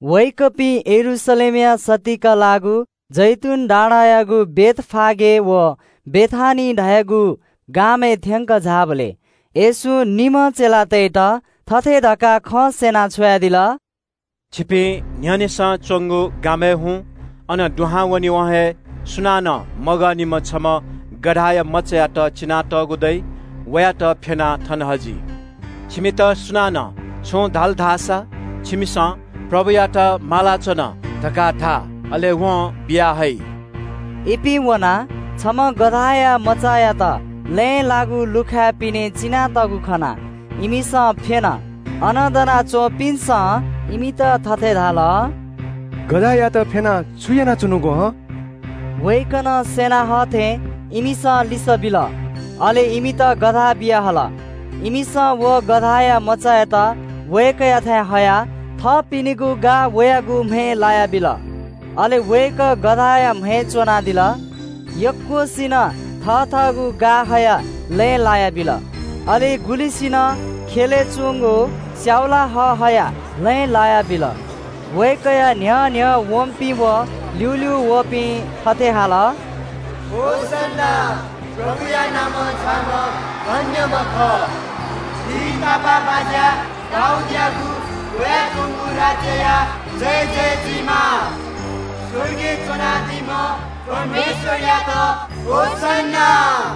वय्‌कःपिं यरूशलेमया सत्तीक लाःगु जैतून डाँडायागु बेथफागे व बेथानिया धाःगु गामय् थ्‍यंकः झाःबलय् येशूं निम्‍ह चेलातय्‌त थथे धकाः खँ स्‍यनाः छ्वयादिल – “छिपिं न्‍ह्यःनेसं च्‍वंगु गामय् हुँ। अन दुहां वनेवं हे सुनानं मगःनिम्‍ह छम्‍ह गधाया मचायात चिनातःगु खनी। वयात फ्‍यनाः थन हजि। छिमित सुनानं छुं धाल धाःसा, छिमिसं – ‘प्रभुयात माला च्‍वन’ धकाः धा। अले वं बिया हइ।” इपिं वनाः छम्‍ह गधाया मचायात लँय् लाःगु लुखाय् पिने चिनातःगु खनाः इमिसं वयात फ्‍यन। अन दना च्‍वंपिन्‍सं इमित थथे धाल – “गधायात फ्‍यनाः छु यानाच्‍वनागु हं?” वय्‌कलं स्‍यना हः थें इमिसं लिसः बिल। अले इमित गधा बियाहल। इमिसं व गधाया मचायात वय्‌कःयाथाय् हयाः थःपिनिगु गा वयागु म्‍हय् लायाबिल। अले वय्‌कः गधाया म्‍हय् च्‍वनादिल। यक्‍वसिनं थथःगु गा हयाः लँय् लायाबिल, अले गुलिसिनं ख्‍यलय् च्‍वंगु स्‍याउला हः हयाः लँय् लाय् हल। वय्‌कःया न्‍ह्यः न्‍ह्यः वंपिं व ल्‍यूल्‍यू वःपिं थथे हाल – “होसन्‍ना, प्रभुया नामं झाःम्‍ह धन्‍यम्‍ह खः। झी तापाःबाज्‍या दाऊदयागु वयाच्‍वंगु राज्‍यया जयजय जुइमा। स्‍वर्गय् च्‍वनादीम्‍ह परमेश्‍वरयात होसन्‍ना।”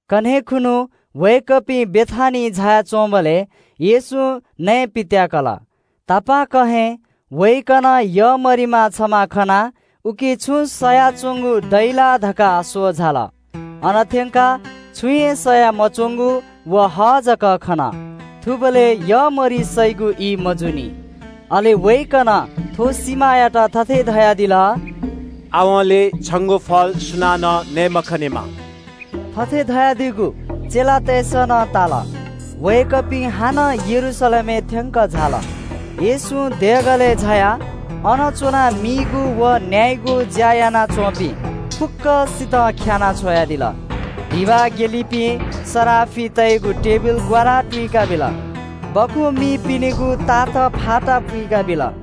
कन्‍हय् खुन्‍हु वय्‌कःपिं बेथानियां झाया च्‍वंबलय् येशूं नयेपित्‍याकल। तापाकं हे वय्‌कलं छमा वाँउसे च्‍वंगु यःमरिमा खनाः उकी छुं सयाच्‍वंगु दइ ला धकाः स्‍वः झाल। अन थ्‍यंकाः छुं हे सया मच्‍वंगु व हः जक खन। थुबलय् यःमरि सइगु ई मजूनि। अले वय्‌कलं थ्‍व सिमायात थथे धयादिल – “आवंलि छंगु फल सुनानं नये मखनेमा।” थथे धयादीगु चेलातय्‌सं नं ताल। वय्‌कःपिं हानं यरूशलेमय् थ्‍यंकः झाल। येशूं देगलय् झायाः अन च्‍वनाः मीगु व न्‍यायेगु ज्‍या यानाच्‍वंपिं फुक्‍कसितं ख्‍यानाः छ्वयादिल। धिबा हिलीपिं सराफितय्‌गु टेबिल ग्‍वारा तुइकाबिल, सुकुभतु मीपिनिगु ताथ फाता पुइकाबिल।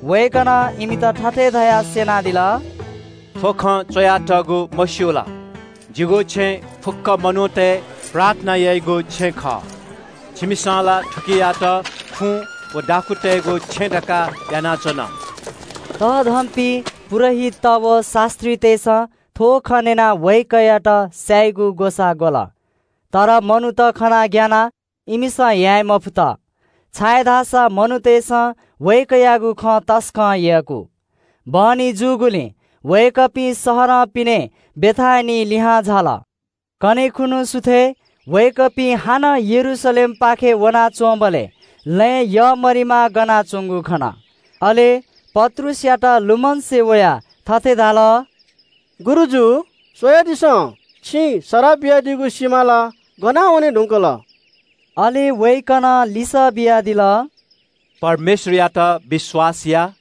वय्‌कलं इमित थथे धयाः स्‍यनादिल – “थ्‍व खँ च्‍वयातःगु, मस्‍यू ला? ‘जिगु छेँ फुक्‍क मनूतय् प्रार्थना याइगु छेँ खः।’ छिमिसं ला थुकियात खुँ व दाखुँतय्‌गु छेँ धकाः यानाच्‍वन।” तःधंपिं पुजाहारीत व शास्‍त्रीतय्‌सं थ्‍व खँ न्‍यनाः वय्‌कःयात स्‍यायेगु ग्‍वसाः ग्‍वल। तर मनूत खनाः ग्‍यानाः इमिसं याये मफुत, छाय्‌धाःसा मनूतय्‌सं वय्‌कःयागु खँ तसकं यय्‌कू। बहनी जूगुलिं वय्‌कःपिं शहरं पिने बेथानियाय् लिहां झाल। कन्‍हय् खुन्‍हु सुथय् वय्‌कःपिं हानं यरूशलेमपाखें वनाच्‍वंबलय् लँय् यःमरिमा गना च्‍वंगु खन। अले पत्रुसयात लुमंसे वयाः थथे धाल – “गुरुजु, स्‍वयादिसँ, छिं सराः बियादीगु सिमा ला गनावने धुंकल।” अले वय्‌कलं लिसः बियादिल – “परमेश्‍वरयात विश्‍वास या।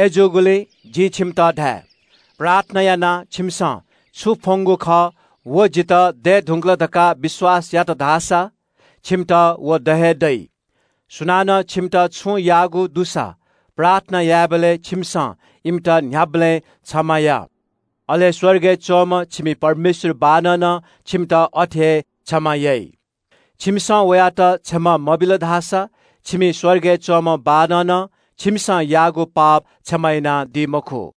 अय्‌जूगुलिं जिं छिमित धाये – प्रार्थना यानाः छिमिसं छु फ्‍वंगु खः व जितः दये धुंकल धकाः विश्‍वास यात धाःसा छिमित व द हे दइ। सुनानं छिमित छुं याःगु दुसा प्रार्थना यायेबलय् छिमिसं इमित न्‍ह्याबलें क्षमा या, अले स्‍वर्गय् च्‍वनादीम्‍ह छिमि परमेश्‍वर बाःनं नं छिमित अथे हे क्षमा याइ। छिमिसं वयात क्षमा मबिल धाःसा छिमि स्‍वर्गय् च्‍वनादीम्‍ह बाःनं नं छिमिसं याःगु पाप क्षमा यानादी मखु।”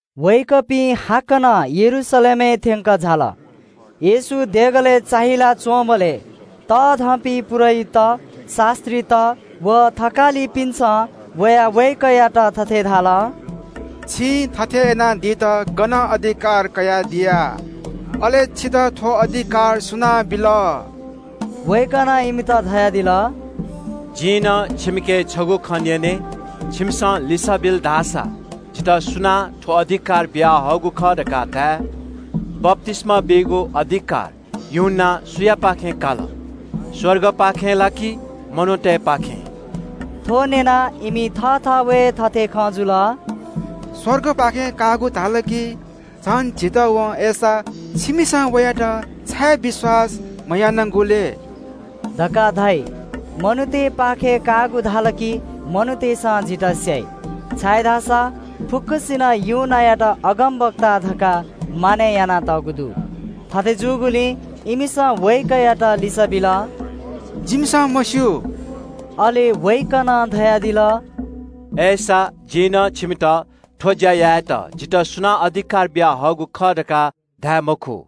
वय्‌कःपिं हाकनं यरूशलेमय् थ्‍यंकः झाल। येशू देगःया चुकय् चाःहिला च्‍वनादीबलय् तःधंपिं पुजाहारीत, शास्‍त्रीत, व थकालिपिन्‍सं वयाः वय्‌कःयात थथे धाल – “छिं थथे याना दित गनं अधिकार कयादिया? अले छितः थ्‍व अधिकार सुनां बिल?” वय्‌कलं इमित धयादिल – “जिं नं छिमिके छगू खँ न्‍यने, छिमिसं लिसः बिल धाःसा जितः सुनां थ्‍व अधिकार बियाहःगु खः धकाः धाये। बप्‍तिस्‍मा बीगु अधिकार यूहन्‍नां सुयापाखें काल? स्‍वर्गपाखें ला कि मनूतय्‌पाखें?” थ्‍व न्‍यनाः इमि थःथवय् थथे खँ जुल – “स्‍वर्गपाखें काःगु धाल कि झन झीत वं ‘अय्‌सा, छिमिसं वयात छाय् विश्‍वास मयानागु लय्?’ धकाः धाइ। मनूतय्‌पाखें काःगु धाल कि मनूतय्‌सं झीत स्‍याइ, छाय्‌धाःसा फुक्‍कसिनं यूहन्‍नायात अगमवक्ता धकाः मानय् यानातःगु दु।” थथे जूगुलिं इमिसं वय्‌कःयात लिसः बिल – “जिमिसं मस्‍यू।” अले वय्‌कलं धयादिल – “अय्‌सा, जिं नं छिमित थ्‍व ज्‍या यायेत जितः सुनां अधिकार बियाहःगु खः धकाः धाये मखु।”